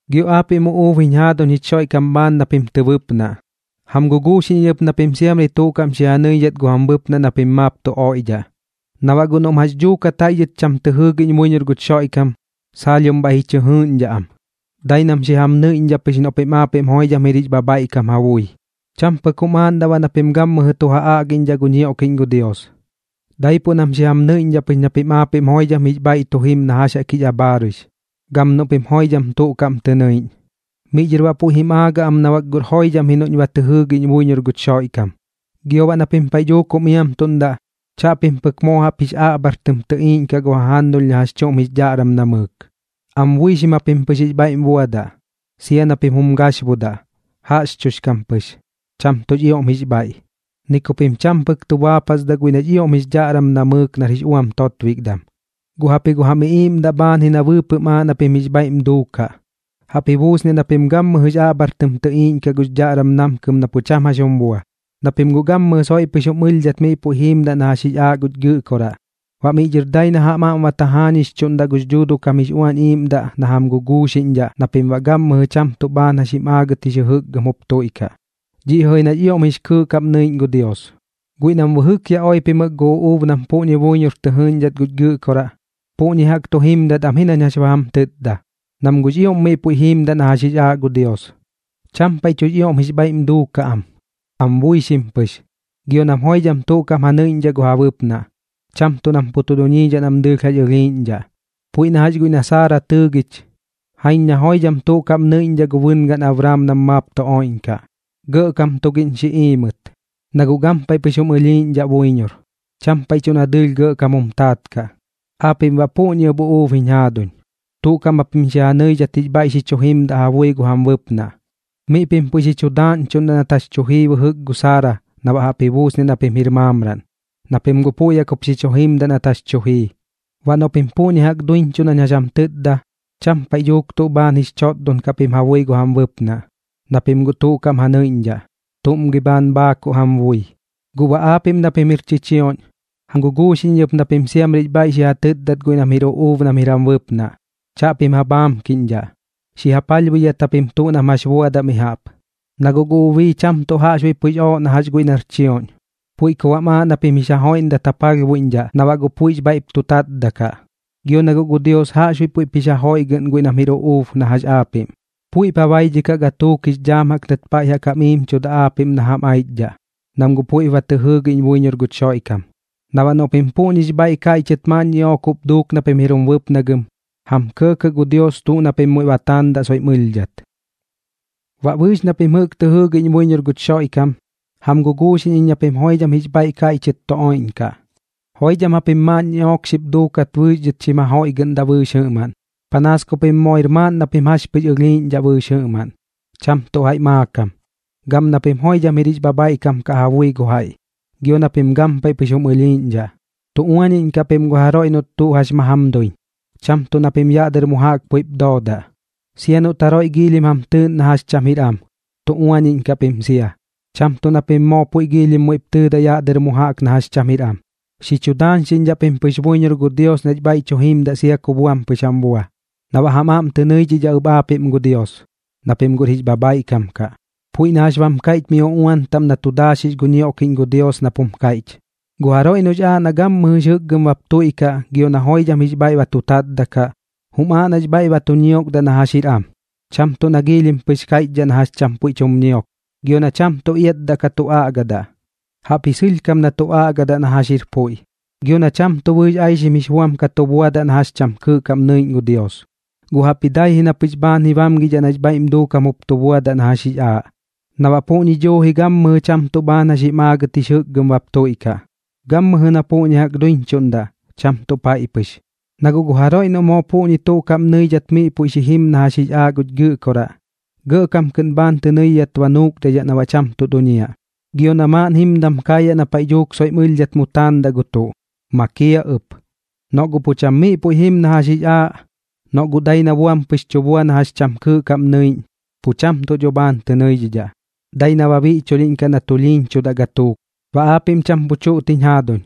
Gio aapiꞌm uꞌuub jiñ jaaduñ jich Xoiꞌkam bhaan na pim tɨ bɨpnaꞌ, jam guguuxiꞌñ iñ ɨp na pim siamri tuꞌ kaꞌm xi ja nɨidhat gu jam bɨpnaꞌ na pim maap tu oiꞌdhaꞌ, na baꞌ guꞌ noꞌm jax dhuukat jaiꞌ dhɨt cham tɨ jɨɨgiꞌñ buiñor guch Xoiꞌkam, saalhiom bhaiꞌ ji chɨ jɨɨꞌñdhaꞌ am, dai nam xi jam nɨiꞌñdhaꞌ pɨx noꞌ pim aapiꞌm joidham jir jix bhabhaiꞌkam ja bui. Cham pɨk jum aaꞌndaꞌ baꞌ na pim gammɨjɨ tu ja aꞌgiꞌñdhaꞌ gu ñioꞌkiꞌñ gu Dios, daipuꞌ nam xi jam nɨiꞌñdhaꞌ pɨx na pim aapiꞌm joidham jix bhaiꞌ tu jim na jax jaꞌk jix abhaaruix, gam noꞌ pim joidham tuꞌ kaꞌm tɨ nɨiꞌñ. Miꞌ dhɨr baꞌ puiꞌ jim aagaꞌ am na bak guꞌr joidham ji noꞌñ ba tɨ jɨɨgiꞌñ buiñor guch Xoiꞌkam. Gio baꞌ na pim paiꞌ dhuuk jum iamtuꞌndaꞌ, chaꞌpim pɨk moo jaꞌp jix aꞌbhar tɨm tɨtɨiꞌñdhaꞌ gu jajannulh na jax chuꞌm jix dhaꞌram namɨɨk, am buixim japim pɨx jix bhaiꞌm buadaꞌ. Sia na pim jum gaxbudaꞌ, jaꞌxchudhix kam pɨx, cham tuꞌx ioꞌm jix bhaiꞌ, ni ku pim cham pɨk tu baapasdaꞌ guiꞌ nax ioꞌm jix dhaꞌram namɨɨk nar jix uam totbikdam. Guꞌ jaꞌpji gu jam iꞌiiꞌmdaꞌ bhaan ji na bɨɨpɨꞌm aaꞌ na pim jix bhaiꞌm duukaꞌ. Jaꞌp ji buusniaꞌ na pim gammɨjɨx aꞌbhar tɨm tɨꞌiiꞌñkaꞌ gux dhaꞌram namkɨm na pu cham jax jum bua, na pim guꞌ gammɨjɨ soiꞌ pɨx jum ɨlhdhat miꞌ puiꞌ jiimdaꞌ na jax jix aaꞌ guch Gɨꞌkoraꞌ. Baꞌ miꞌ dhɨr dai na jam aꞌm ba tajaañixchuꞌndaꞌ gux Dhuuduꞌ kam jix Uañ Iiꞌmdaꞌ na jam guguuxiꞌñdhaꞌ na pim baꞌ gammɨjɨ cham tuꞌ bhaan jax jim aagɨt jix jɨjɨkgɨm jup tuiꞌkaꞌ. Dhiꞌ jɨꞌ ji nax ioꞌm jix kɨɨꞌ kaꞌm nɨiꞌñ gu Dios. Guiꞌ nam bɨjɨk yaꞌ oipimɨk gu uꞌuub nam puꞌñi buiñor tɨ jɨɨꞌñdhat guch Gɨꞌkoraꞌ, puꞌñi jaꞌk tu jimdat am ji nañ jax ba jam tɨtda, nam guꞌx ioꞌm miꞌ puiꞌ jiimdaꞌ na jax jix aaꞌ gu Dios. Cham paiꞌ tuꞌx ioꞌm jix bhaiꞌm duukaꞌ am, am buixim pɨx, gio nam joidham tuꞌ kaꞌm ja nɨiꞌñdhaꞌ gu ja bɨpnaꞌ, cham tuꞌ nam pu tu duñiidhaꞌ nam dɨɨlh jax ɨlhiiꞌñdhaꞌ. Puiꞌ na jax guiꞌ na Saara tɨɨgich, jaiñ na joidham tuꞌ kaꞌm nɨiꞌñdhaꞌ gu bɨngaꞌn Abraam nam maap tu oiꞌñkaꞌ, gɇꞌkam tugiꞌñ xi iimɨt, na guꞌ gampaiꞌ pɨx jum ɨlhiiꞌñdhaꞌ buiñor, cham paiꞌ tuꞌ na dɨɨlh gɇꞌkam jum taat kaꞌ. Aapiꞌm baꞌ puꞌñi ɨp uꞌuub jiñ jaaduñ, tuꞌ kaꞌm japim xi ja nɨidhat jix bhaiꞌ xi chu jimdaꞌ ja bui gu jam bɨpnaꞌ. Miꞌ pim puiꞌ xi chu daaꞌñchuꞌndaꞌ nat jax chu jii bɨjɨk gu Saara na baꞌ jaꞌp ji buusniaꞌ na pim jir maamraꞌn, na pim guꞌ puiꞌ jaꞌk jup xi chu jimdaꞌ nat jax tu jii. Baꞌ noꞌ pim puꞌñi jaꞌk duiñchuꞌ nañ jax jam tɨtda, cham paiꞌ dhuuk tuꞌ bhaan jix chotdon kaꞌ pim ja bui gu jam bɨpnaꞌ, na pim guꞌ tuꞌ kaꞌm ja nɨiꞌñdhaꞌ. ¿Tuꞌm gi bhaan bhaakuꞌ jam bui? Guꞌ baꞌ aapiꞌm na pim jir chichioꞌñ, jam guguuxiꞌñ iñ ɨp na pim siamrix bhaiꞌp xi ja tɨtdat guiꞌ nam jir uꞌuub nam jir jam bɨpnaꞌ. Chaꞌpim ja bhaamkiꞌñdhaꞌ, xi ja palhbuidhat japim tuꞌ nam jax buadaꞌ mi jaꞌp. Na guꞌ gu ubii cham tuꞌ jaꞌxbuiꞌ puiꞌx ooꞌ na jax guiꞌ nar chioꞌñ, puiꞌ ku baꞌm aaꞌ na pim jix ja joiꞌndat ja palhbuiꞌñdhaꞌ na baꞌ guꞌ puiꞌx bhaiꞌ tu tatdaꞌ kaꞌ. Gio na guꞌ gu Dios jaꞌxbuiꞌ puiꞌp jix ja joiꞌgɨꞌn guiꞌ nam jir uꞌuub na jax aapiꞌm, puiꞌp ja baidhikaꞌ gatuuk jix dhaam jaꞌk nat paiꞌ jam iimchuda aapiꞌm na jam aichdhaꞌ, nam guꞌ puiꞌp ba tɨ jɨɨgiꞌñ buiñor guch Xoiꞌkam. Na baꞌ noꞌ pim puꞌñix bhaiꞌ kaiꞌchɨt maaꞌn ñiꞌook jup duuk na pim jir jum bɨpnagɨm, jam kɇɇkɇꞌ gu Dios tuꞌ na pim muiꞌ ba taandaꞌ soiꞌm ɨlhdhat. Baꞌ bɨɨx na pim jɨꞌk tɨ jɨɨgiꞌñ buiñor guch Xoiꞌkam, jam guguuxiꞌñ iñ na pim joidham jix bhaiꞌ kaiꞌchɨt tu oiꞌñkaꞌ. Joidham japim maaꞌn ñiꞌook xip duukat bɨɨx dhɨt xim ja joiꞌgɨꞌndaꞌ bɨɨx jɨꞌmaꞌn, panaas ku pim moo jir maaꞌn na pim jax pɨx ɨlhiiꞌñdhaꞌ bɨɨx jɨꞌmaꞌn, cham tuꞌ jaiꞌ maakam. Gam na pim joidham jir jix bhabhaiꞌkam kaꞌ ja bui gu jaiꞌ, gio na pim gampaiꞌ pɨx jum ɨlhiiꞌñdhaꞌ. Tu uañiꞌñkaꞌ pim gu jaroiꞌ noꞌt tuꞌ jax ma jam duiñ, cham tuꞌ na pim yaꞌ dɨr mu jaꞌk puiꞌp doodaꞌ. Sia noꞌt jaroiꞌ giilhim jam tɨɨꞌn na jax cham jir am, tu uañiꞌñkaꞌ pim sia, cham tuꞌ na pim moo puiꞌ giilhim muiꞌp tɨɨdaꞌ yaꞌ dɨr mu jaꞌk na jax cham jir am. Xi chu daañxiꞌñdhaꞌ pim pɨx buiñor gu Dios nax bhaiꞌ tu jimdaꞌ sia ku buam pɨx jam bua, na baꞌ jam aꞌm tɨ nɨidhidhaꞌ ɨp aapiꞌm gu Dios, na pim guꞌr jix bhabhaiꞌkam kaꞌ. Puiꞌ na jax bam kaiꞌch miꞌ paiꞌ uꞌuan taꞌm na tu daaxix gu ñioꞌkiꞌñ gu Dios nap jum kaiꞌch: Gu jaroiꞌ noꞌx aaꞌ na gammɨjɨx jɨkgɨm bap tuiꞌkaꞌ gio na joidham jix bhaiꞌ ba tu tatdaꞌ kaꞌ, jum aaꞌ nax bhaiꞌ ba tu ñiokdaꞌ na jax jir am, cham tuꞌ na giilhim pɨx kaiꞌchdhaꞌ na jax cham puiꞌ tum ñiok, gio na cham tuꞌ iatdaꞌ ka tu aꞌgadaꞌ, jaꞌpji sɨlhkam na tu aꞌgadaꞌ na jax jir puiꞌ. Gio baꞌ na cham tuꞌ bɨɨx aixim jix buam ka tu buadaꞌ na jax cham kɨɨꞌ kaꞌm nɨiꞌñ gu Dios, guꞌ jaꞌpji dai ji na pɨx bhaan ji bamgidhaꞌ nax bhaiꞌm duukam bap tu buadaꞌ na jax jix aaꞌ, na baꞌ puꞌñi duuji gammɨjɨ cham tuꞌ bhaan jax jim aagɨt jix jɨkgɨm bap tuiꞌkaꞌ, gammɨjɨ na puꞌñi jaꞌk duiñchuꞌndaꞌ, cham tuꞌ paiꞌ pɨx. Na guꞌ gu jaroiꞌ noꞌ moo puꞌñi tuꞌ kaꞌm nɨidhat miꞌ puiꞌ xi jim na jax jix aaꞌ guch Gɨꞌkoraꞌ, gɇꞌkam kɨꞌn bhaan tɨ nɨidhidhat ba nuukdaidhaꞌ na baꞌ cham tuꞌ duñiaꞌ, gio na maaꞌn jimdam kaayaꞌ na paiꞌ dhuuk soiꞌm ɨlhdhat mu taandaꞌ gu tuꞌ, makiaꞌ ɨp. Noꞌ guꞌ pu cham miꞌ puiꞌ jim na jax jix aaꞌ, noꞌ guꞌ dai na buam pɨx tu bua na jax cham kɨɨꞌ kaꞌm nɨiꞌñ, pu cham tuꞌ dho bhaan tɨ nɨidhidhaꞌ, dai na ba biꞌchulhiꞌñkaꞌ na tulhiiñchudaꞌ gatuuk. Baꞌ aapiꞌm cham pu chuꞌt jiñ jaaduñ,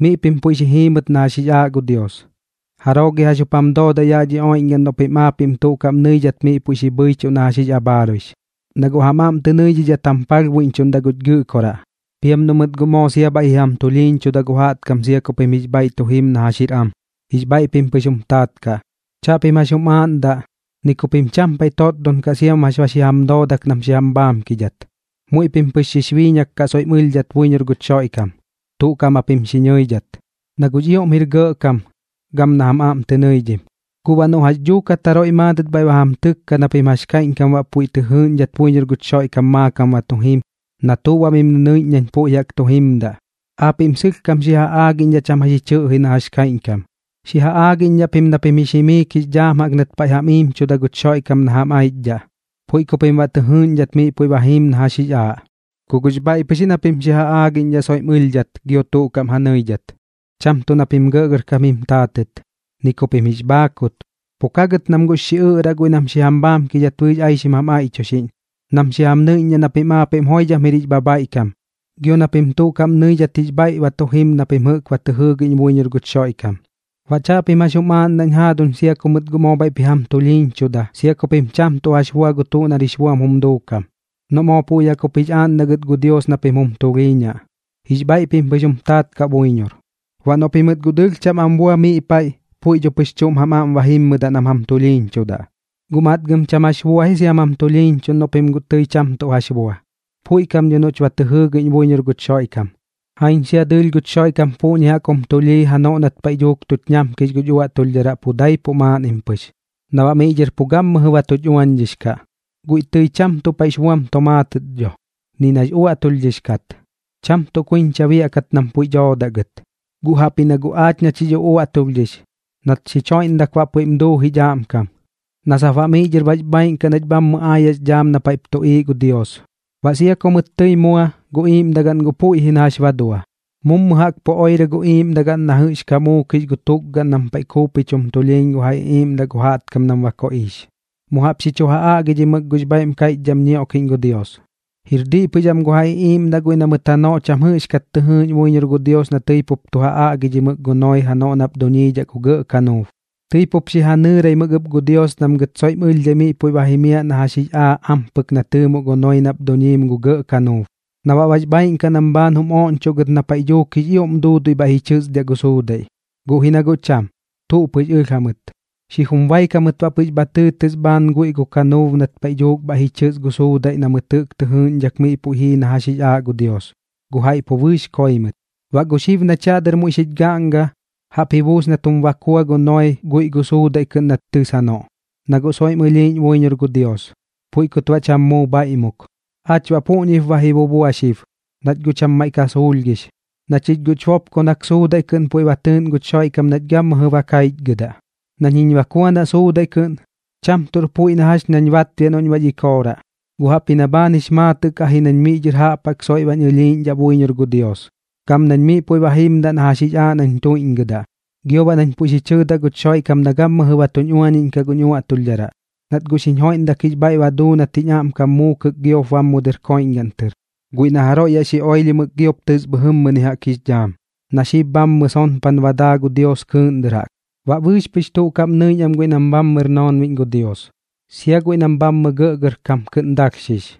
miꞌ pim puiꞌ xi jiimɨt na jax jix aaꞌ gu Dios. ¿Jaroo gi jax jup jam doodaꞌ yaꞌ dhi oiꞌñgaꞌn noꞌ pim aapiꞌm tuꞌ kaꞌm nɨidhat miꞌ puiꞌ xi bhɨichuꞌ na jax jix abhaaruix? Na guꞌ jam aꞌm tɨ nɨidhidhat jam palhbuiꞌñchuꞌndaꞌ guch Gɨꞌkoraꞌ. Piam noꞌ mɨt guꞌ moo sia bhaiꞌ ji jam tulhiiñchuda gu jaꞌtkam sia ku pim jix bhaiꞌ tu jim na jax jir am, jix bhaiꞌ pim pɨx jum taat kaꞌ. Chaꞌpim jax jum aaꞌndaꞌ, ni ku pim cham paiꞌ totdon kaꞌ siam jax ba xi jam doodak nam xi jam bhaamkidhat. Muiꞌ pim pɨx xix biiñak kaꞌ soiꞌm ɨlhdhat buiñor guch Xoiꞌkam, tuꞌ kaꞌm japim xi nɨidhat, na guꞌx ioꞌm jir gɇꞌkam gam na jam aꞌm tɨ nɨidhim. Guꞌ baꞌ noꞌ jax dhuukat jaroiꞌ maadɨt bhaiꞌ ba jam tɨkkaꞌ na pim jax kaiꞌñkam baꞌ puiꞌ tɨ jɨɨꞌñdhat buiñor guch Xoiꞌkam maakam ba tu jim, na tuꞌ baꞌ mim nɨnɨiꞌñ nañ puiꞌ jaꞌk tu jimdaꞌ, aapiꞌm sɨlhkam xi ja aagiꞌñdhaꞌ cham jax ji chɨꞌji na jax kaiꞌñkam. Xi ja aagiꞌñdhaꞌ pim na pim jix jimiik jix dhaam jaꞌk nat paiꞌ jam iimchuda guch Xoiꞌkam na jam aichdhaꞌ, puiꞌ ku pim baꞌ tɨ jɨɨꞌñdhat miꞌ puiꞌ ba jiim na jax jix aaꞌ. Ku guꞌx bhaiꞌ pɨx ji na pim xi ja aagiꞌñdhaꞌ soiꞌm ɨlhdhat gio tuꞌ kaꞌm ja nɨidhat, cham tuꞌ na pim gɇꞌgɇrkam jim taatɨt, ni ku pim jix bhaakut. Pu ka gɨt nam guꞌx xiꞌɨꞌraꞌ guiꞌ nam xi jam bhaamkidhat bɨɨx aixim jam aiꞌchuxiꞌñ, nam xi jam nɨiꞌñdhaꞌ na pim aapiꞌm joidham jir jix bhabhaiꞌkam gio na pim tuꞌ kaꞌm nɨidhat jix bhaiꞌ tu jim na pim jɨꞌk ba tɨ jɨɨgiꞌñ buiñor guch Xoiꞌkam. Baꞌ chaꞌpim jax jum aaꞌndaꞌñ jaaduñ sia ku mɨt guꞌ moo bhaiꞌp ji jam tulhiiñchuda sia ku pim cham tuꞌ jax bua gu tuꞌ nar jix buam jum duukam, noꞌ moo puiꞌ jaꞌk jup jix aaꞌndaꞌ gɨt gu Dios na pim jum tulhiiñaꞌ. Jix bhaiꞌ pim pɨx jum taat kaꞌ buiñor. Baꞌ noꞌ pimɨt guꞌ dɨɨlh cham am bua miꞌ paiꞌ, puiꞌ dho pɨx chuꞌm jam aꞌm ba jimmɨdaꞌ nam jam tulhiiñchudaꞌ. Guꞌ matgɨm cham jax bua ji siam jam tulhiiñchuꞌn noꞌ pim guꞌ tɨi cham tuꞌ jax bua. Puiꞌ kam dho noꞌch ba tɨ jɨɨgiꞌñ buiñor guch Xoiꞌkam. Jaiñ sia dɨɨlh guch Xoiꞌkam puꞌñi pɨk jum tulhii janoꞌ nat paiꞌ dhuuk tuch ñamkix guch uaꞌtulhdharaꞌ pu daipuꞌ maaꞌnnim pɨx, na baꞌ miꞌ dhɨr pu gammɨjɨ ba tuch uañdhix kaꞌ. Guiꞌ tɨi cham tuꞌ paiꞌx buam tomaatɨt dho, ni nax uaꞌtulhdhix kat, cham tuꞌ kuiñcha biaꞌkat nam puiꞌ doodaꞌ gɨt. Guꞌ jaꞌpji na guꞌ aachiꞌ nach jix uꞌuaꞌtulhdhix, nat xich joiꞌndat baꞌ puiꞌm duu jich aꞌmkam, na sap baꞌ miꞌ dhɨr bax bhaaiꞌn kaꞌ nach bhammɨ aayaꞌx dhaam na paiꞌp tuꞌiiꞌ gu Dios. Baꞌ sia ku mɨt tɨi mua, gu iiꞌmdagaꞌn guꞌ puiꞌ ji na jax ba dua, mummu jaꞌk pu oirɨ gu iiꞌmdagaꞌn na jɨꞌx ka muukix gu tukgaꞌn nam paiꞌ kuupich jum tulhiiñ gu ja iꞌiiꞌmdaꞌ gu jaꞌtkam nam ba koꞌiix. Mu jaꞌp xi chu ja aꞌgidhimɨk gux bhaiꞌm kaiꞌchdham ñioꞌkiꞌñ gu Dios. Jir diꞌ pɨx am gu ja iꞌiiꞌmdaꞌ guiꞌ na mɨt janoꞌ cham jɨꞌxkat tɨ jɨɨꞌñ buiñor gu Dios na tɨi pup tu ja aꞌgidhimɨk gu Noee janoꞌ nap duñiidhaꞌ gu gɇꞌ kanuub. Tɨi pup xi ja nɨɨraimɨk ɨp gu Dios nam gɨt soiꞌm ɨlhdhai miꞌ puiꞌ ba jimiaꞌ na jax jix aaꞌ ampɨk na tɨɨmoꞌ gu Noee nap duñiim gu gɇꞌ kanuub, na baꞌ bax bhaaiꞌn kaꞌ nam bhaan jum oꞌñchoꞌ gɨt na paiꞌ dhuuk jix ioꞌm duudui bhaiꞌ ji chɨsdiaꞌ gu suudaiꞌ. Guꞌ ji na guꞌ cham, tuꞌ pɨx ɨlh jamɨt. Xijum baik jamɨt baꞌ pɨx bha tɨɨtɨs bhaan guiꞌ gu kanuub nat paiꞌ dhuuk bhaiꞌ ji chɨs gu suudaiꞌ na mɨt jɨꞌk tɨ jɨɨꞌñdhak miꞌ puiꞌ jii na jax jix aaꞌ gu Dios, gu jaiꞌ pu bɨɨx koi mɨt. Baꞌ gu xib nach yaꞌ dɨr muiꞌ xich gaꞌnga, jaꞌp ji buus nat jum bakua gu Noee guiꞌ gu suudaiꞌ kɨꞌn nat tɨs janoꞌ, na guꞌ soiꞌm ɨlhiiꞌñ buiñor gu Dios, puiꞌ kut baꞌ cham muu bhaiꞌmuk. Aach baꞌ puꞌñip ba ji bubua xib, nach guꞌ cham tuꞌ maiꞌ ka suulhgix, na chich guꞌch bopkonak suudaiꞌ kɨꞌn puiꞌ ba tɨɨꞌn guch Xoiꞌkam nach gammɨjɨ ba kaichgɨdaꞌ. Nañ jiñ bakuanaꞌ suudaiꞌ kɨꞌn, cham tuꞌr puiꞌ na jax nañ batbiaꞌ noꞌñ bax ikooraꞌ, guꞌ jaꞌpji na bhaan jix maatɨꞌ kaꞌ ji nañ miꞌ dhɨr jaꞌp jaꞌk soiꞌ bañ ɨlhiiꞌñdhaꞌ buiñor gu Dios, gam nañ miꞌ puiꞌ ba jimdaꞌ na jax jaꞌk jix aaꞌ nañ tuiꞌñgɨdaꞌ, gio baꞌ nañ puiꞌ xi chɨɨdaꞌ guch Xoiꞌkam na gammɨjɨ ba tuñ uañiꞌñkaꞌ guñ uaꞌtulhdharaꞌ, nat guꞌ xiñ joiꞌndak jix bhaiꞌ ba duu nat jiñ aꞌmkam muukɨk giop bam mu dɨr koiꞌñgaꞌn tɨr, guiꞌ na jaroiꞌ yaꞌ xi oilhimɨk giop tɨs bhɨjɨmmɨni jaꞌk jix dhaam, na xib bhammɨ sonpan ba daa gu Dios kɨɨꞌn dɨr jaꞌk. Baꞌ bɨɨx pɨx tuꞌ kaꞌm nɨiꞌñ am guiꞌ nam bhammɨr noonbiꞌñ gu Dios, sia guiꞌ nam bhammɨ gɇꞌgɇrkam kɨꞌn dalhxix.